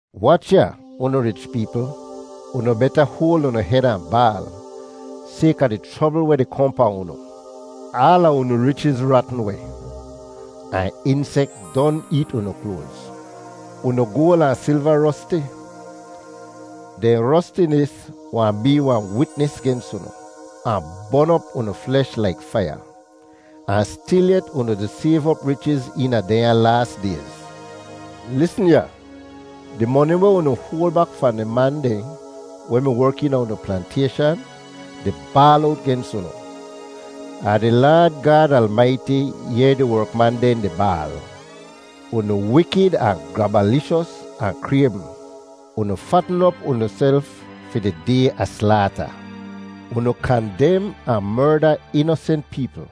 Wach ya, unu rich peepl! Unu beta hoal unu hed ahn baal, sayka di chrobl weh di kohn pahn unu. Aala unu richiz ratn weh, ahn insek don eet unu kloaz. Unu goal ahn silva rosti. Dehn rostinis wahn bee wahn witnis gens unu, ahn bon op unu flesh laik faiya. Ahn stilyet unu di sayv op richiz eena dehnya laas dayz. Lisn ya! Di moni weh unu hoal bak fahn di man dehn weh mi werk eena unu plantayshan di baal owt gens unu. Ahn di Laad Gaad Almaiti yehr di werkman dehn di baal. Unu wikid ahn grabalishos ahn kraybm! Unu fatn op unuself fi di day a slaata. Unu kandem ahn merda inosent peepl,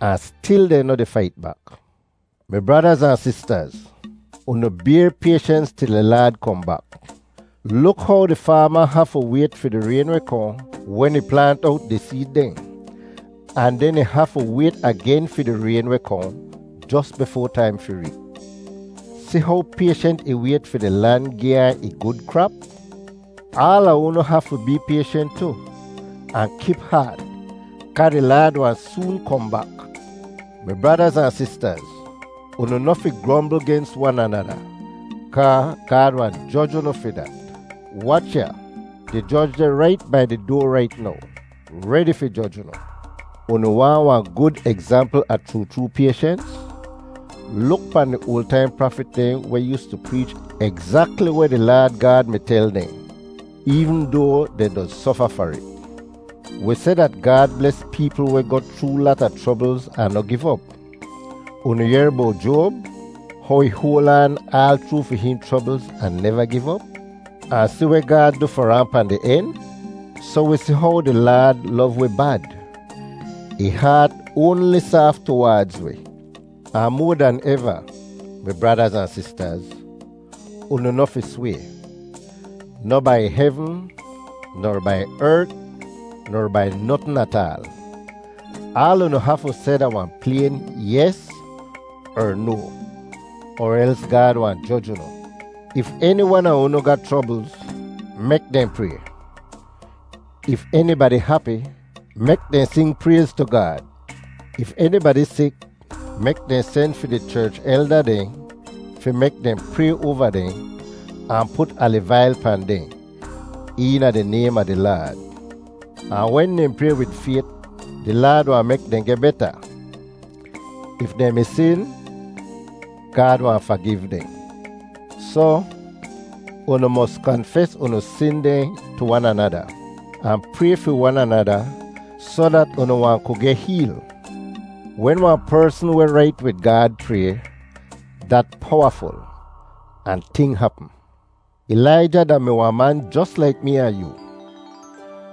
ahn stil dehn noh di fait bak. Mi bradaz ahn sistaz, unu bayr payshens til di Laad kohn bak. Luk how di faama hafu wayt fi di rayn weh kohn wen ih plaant owt di seed dehn, ahn den ih hafu wayt agen fi di rayn weh kohn jos bifoa taim fi reep. Si how payshent ih wayt fi di lan gi ahn ih gud krap? Aala unu hafu bee payshent tu ahn kip haat, kaa di Laad wahn soon kohn bak. Mi bradaz ahn sistaz, unu noh fi grombl gens wan anada kaa Gaad wahn joj unu fi dat. Wach ya! Di Joj deh rait bai di doa rait now, redi fi joj unu. Unu waahn wahn gud egzampl a chroo chroo payshens? Luk pahn di oal taim prafit dehn weh yoostu preech egzakli weh di Laad Gaad mi tel dehn, eevn doa dehn doz sofa far it. Wi seh dat Gaad bles peepl weh goh chroo lata chroblz ahn noh giv op. Unu yehr bowt Joab, how ih hoal aan aal chroo fi hihn chroblz ahn neva giv op? Ahn si weh Gaad du far ahn pahn di en? Soh wi si how di Laad lov wi bad; ih haat oanli saaf tuwaadz wi. Ahn moa dan eva, mi bradaz ahn sistaz, unu noh fi sway—noh bai hevn ner bai ert ner bai notn ataal. Aal unu hafu seh da wahn playn “yes” er “no,” er els Gaad wahn joj unu. If eni wan a unu ga chroblz, mek dehn pray! If enibadi hapi, mek dehn sing prayz tu Gaad! If enibadi sik, mek dehn sen fi di cherch elda dehn fi mek dehn pray oava dehn ahn put aliv ail pahn dehn, eena di naym a di Laad. Ahn wen dehn pray wid fayt, di Laad wahn mek dehn geh beta. If dehn mi sin, Gaad wahn fagiv dehn. Soh, unu mos kanfes unu sin dehn tu wan anada, ahn pray fi wan anada soh dat unu wahn ku geh heel. Wen wahn persn weh rait wid Gaad pray, dat powaful, ahn ting hapm! Ilaija da-mi wahn man jos laik mee ahn yoo.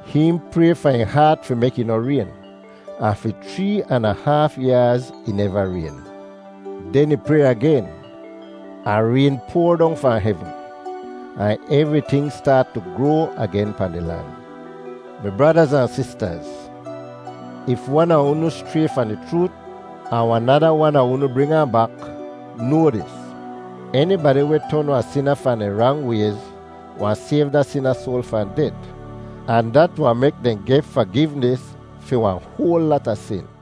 Hihn pray fahn ih haat fi mek ih noh rayn, ahn fi chree an a haaf yaaz ih neva rayn. Den ih pray agen, ahn rayn poar dong fahn hevn, ahn evriting staat tu groa agen pahn di lan. Mi bradaz ahn sistaz, if wan a unu schray fahn di chroot ahn wahn nada wan a unu bring ahn bak, noa dis: Enibadi weh ton wahn sina fahn dehn rang wayz wahn sayv da sina soal fahn det, ahn dat wahn mek dehn geh fagivnis fi wahn hoal lata sin.